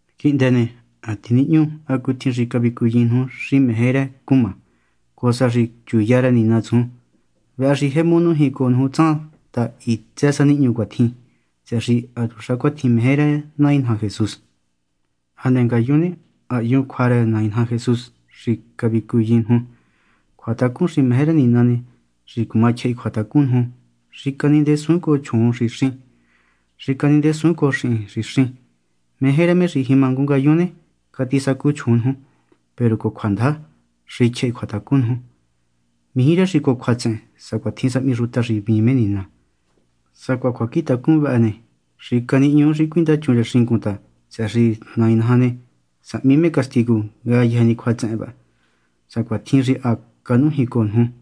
Quihndë ne, ha tinihñú hacutjin xi cavicuyin nuju xi meje rë xi cumá, cojo sa xi chuya rë Nina tsujun. Vëhë xi jemu nújin cojo nuju tsan ta hitsë sa nihñu cuatjin ta, tsëhë xi hatuxa cuatjin meje rë Nai naja Jesús. Hane ngayun ne, ha hyun cjua rë Nai naja Jesús xi ha cavicuyin nuju. Cjuatacun xi meje rë Nina ne; xi cuma tyjahi cjuatacun nuju, xi canindesuun cojo chjuun xi xín, xi canindesuun cojo xihin xi xín. Meje rë me xi jima ngu ngayun ne, catisacu chjuun nuju, peru cojo cjuandaja, xi tyjahi cjuatacun nuju. Mijí rë xi cojo cjuatsehen, sacuatjin sahmi xuta xi hvíin me Nina. Sacuaha cjuacjintacun vëhë ne, xi canihñuu xi cuindachun rë xingun ta, tsëhë xi Nai naja ne, sahmi me castigu ngayëjë ni cjuatsehen vëhë, sacuatjin xi ha canújin cojo nuju.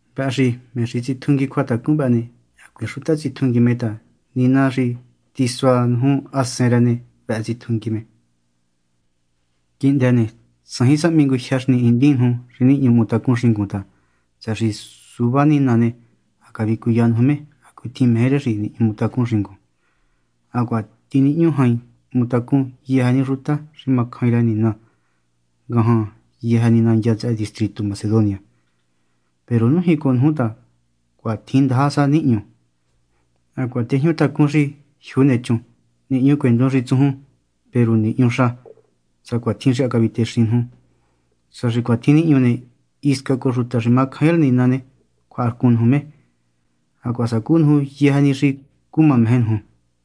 Vëhë xi me xi tsitjungui cjuatacun vëhë ne, hacuiin xuta tsitjungui me ta Nina xi tisua nuju Hasen rë ne, vëhë tsitjungui me. Quihndë ne, tsajin sahmi ngu jyë xi nihindin nuju xi nihñu hmutacun xingun ta, tsëhë xi suvá Nina ne, ha cavicuya nuju me hacutjin meje rë me xi nihñu hmutacun xingun. Hacuaha tinihñú jain hmutacun yëjë ni xuta xi macjain rë Nina ngajan yëjë ni nandya tsëhë distritu Macedonia. Peru nújin cojo nuju ta cuatjin ndaja sa nihñu. Hacuaha tejñu tacún xi jyuu nechun, nihñucuendun xi tsujun. Peru nihñu xa, sacuatjin xi ha cavicuyin nuju. Sa xi cuatjin nihñu ne, hisca cojo xuta xi macjaain rë Nina ne, cjuaharcun nuju me, hacuaha sacú nuju yëjë ni xi cuma meje nuju.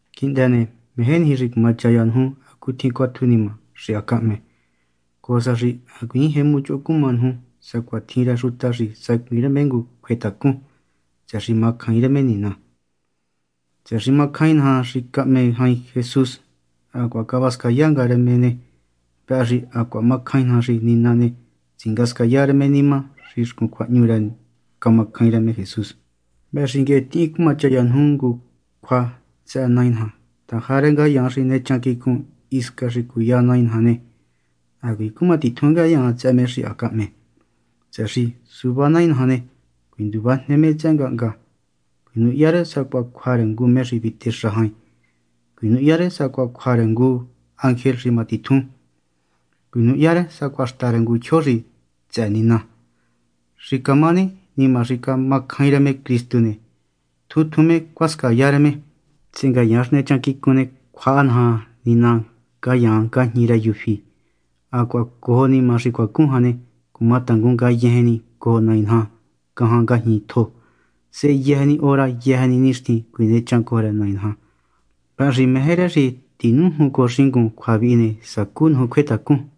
Quihndë ne, meje niji xi cuma chaya nuju hacutjin cuatju nima xi ha cahme, cojo sa xi hacuiin jemu choho cuma nuju sacuatjin rë xuta xi sacuiin rë me ngu cjuetacun, tsëhë xi macjaain rë me Nina. Tsëhë xi macjain naja xi cahme jain Jesús hacuaha cavascaya nga rë me ne, vëhë xi hacuaha macjain naja xi Nina ne, tsingascaya rë me nima xi xcun cjuahñu rë camacjain rë me Jesús. Vëhë xi nguehe tihin cumachaya nuju ngu cjua tsëhë Nai naja ta jarë ngayaan xi nechan quicun hisca xi cuya Nai naja ne, hacuiin cuma titjun ngayaan tsëhë me xi ha cahme. Tsëhë xi suvá Nai naja ne, cuinduvajne me tsëhë ngahnga. Cuinuhya rë sacuaha cjua rë ngu me xi vitexa jain. Cuinuhya rë sacuaha cjua rë ngu ángel xi ma titjun. Cuinuhya rë sacuaha xta rë tyjo xi tsëhë Nina. Xi camá ne, nima xi camacjain rë me Cristu ne, tjun tjun me cuascaya rë me, sehe ngayaan xi nechan quicun ne, cjuaha Nina ngayaan ngajñi rë yufí, hacuaha cojo nima xi cuacun jan, cumatangun ngayejen ni cojo Nai naja ngajan ngajñi tjo. Sehe yëjë ni hora yëjë ni nixtin cuinechan cojo rë Nai naja. Vëhë xi meje rë xi tinújun cojo xingun cjua vihi ne, sacú nuju cjuetacun.